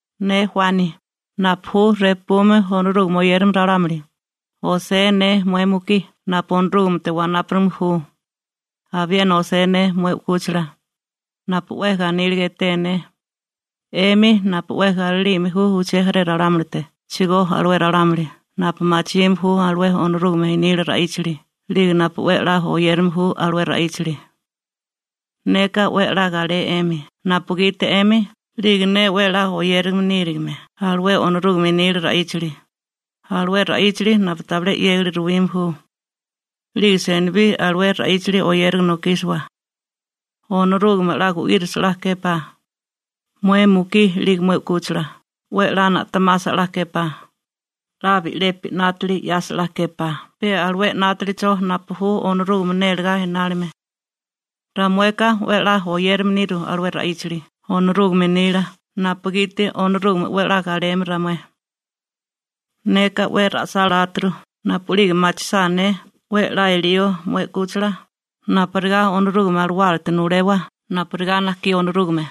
Ne Juani, napu ju repume Onorúgame oyérame ralámuli, osé ne mué mukí napu Onorúgamete wanápurigame ju, abiena osé ne mué u'kúchila, napu 'we ganíliga eté ne, 'emi napu 'we galilime ju uché jaré ralámulitechigó alué ralámuli napu machime ju alué Onorúgame nila ra'íchali 'lige napu 'we 'la oyérame ju alué ra'íchali. Neka 'we 'la galé 'emi napugiti 'emi 'lige ne 'we 'la oyérilime nírigime alué Onorúgame nila ra'íchali, alué ra'íchali napu tabilé 'yégali ruwime ju. 'Lige senibí alué ra'íchali oyériga nokísiwa. Onorúgame 'la gu'írisa 'la képá, mué mukí 'lige mué 'kúchila, 'we 'la na'temasa 'la képá, 'la bi'lepi 'nátili 'yasa 'la képá pe alué 'nátalicho napu ju Onorúgame nélegá inálime. Ramueka 'we 'la oyérilime niru alué ra'íchali Onorúgame nila napugiti Onorúgame 'we 'la galeme ramué. Neka 'we ra'sáláturu napu'lige machisá ne 'we 'la elío mué 'kúchila napurigá Onorúgame Alawálate nulewa napurigá najkí Onorúgame.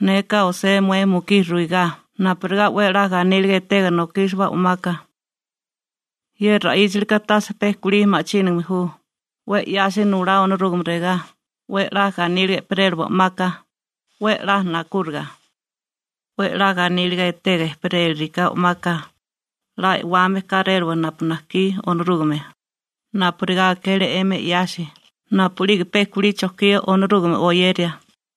Neka osé mué mukí ruigá napurigá 'we 'la ganíliga etega nokísiwa o'maka. Ye ra'íchalika tase pe kulí ma'chínigame ju, 'we 'yasi nulá Onorúgame regá: «'We 'la ganíliga ejperéliwa o'maka, 'we 'la nakúriga.» 'We 'la ganíliga etega ejperéliriká o'maka, 'la e'wame kéréliwa napu najkí Onorúgame, napurigá akele 'emi 'yasi napu'lige pe kulí chojkía Onorúgame oyeria.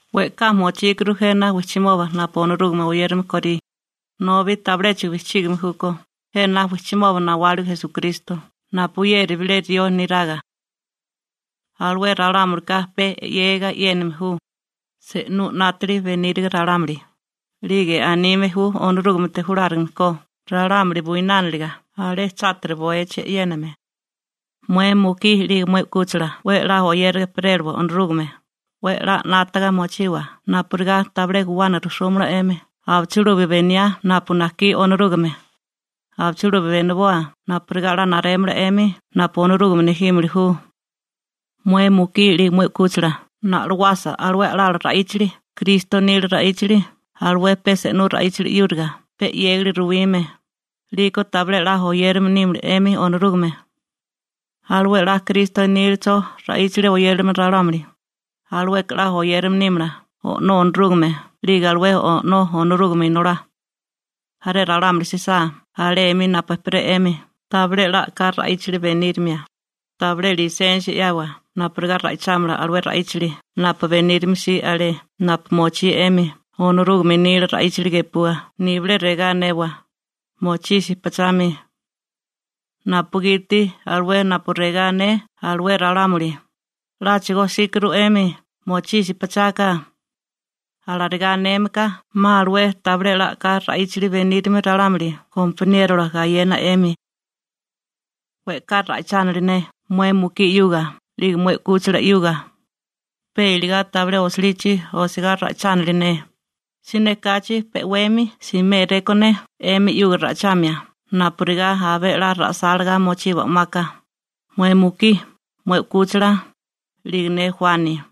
We'ká mochíkuru jena wijchimoba napu Onorúgame oyérame korí, nobi tabiléchigo bijchígime júkó jena wijchimoba nawáligo Esukristo napuyeri bilé rió neraga. Alué ralámulika pe 'yégiga e'yéname ju, se'nú 'nátili beníriga ralámuli, 'lige anime ju Onorúgamete julárigame ko ralámuli buinániliga alé chátiri bowechi e'yéname. Mué mukí 'lige mué 'kúchila 'we 'la oyériga ejperéliwa Onorúgame, 'we 'la 'nátaga mochiwa napurigá tabilé guwana rujsúmala 'emi abichilubi beniá napu najkí Onorúgame, abichilubi beniboa napurigá 'la narémala 'emi napu Onorúgame nejímili ju. Mué mukí 'lige mué 'kúchila na'loasa alué a'lala ra'íchali Kristo nila ra'íchali alué pe se'nú ra'íchali 'yúriga pe 'yégali ruwime, 'liko tabilé a'lá oyérame nímala 'emi Onorúgame. Alué 'la Kristo nílacho ra'íchali oyérame ralámuli, alueka 'la oyérame nímala O'nó Onorúgame 'lige alué O'nó Onorúgame Inolá. Jaré ralámuli jsisá alé 'mi napu 'emi ejperé, tabilé 'la a'ká ra'íchali benírimia, tabilé lisensia 'yawa napurigá ra'ichámala alué ra'íchali napu benírimia si alé napu mochí 'emi Onorúgame nila ra'íchali gepua nibilé regá anewa: «¡Mochisi pachami!», napugiti alué napu regá ané alué ralámuli: «¡'Láchigo jsíkuru 'emi, mochisi pachaka!» Alarigá aneme ka 'ma alué tabilé 'la a'ká ra'íchali benírame ralámuli gompaniérola gayena 'emi. We'ká ra'ichánili ne mué mukí 'yuga 'lige mué 'kúchila 'yuga, pe iligá tabilé osilichi osigá ra'ichánili ne, siné kachi pe 'wemi simé rekó ne 'emi 'yuga ra'ichamia napurigá abé 'la ra'sálagá mochiwa o'maka, mué mukí, mué 'kúchila, 'lige ne Juani.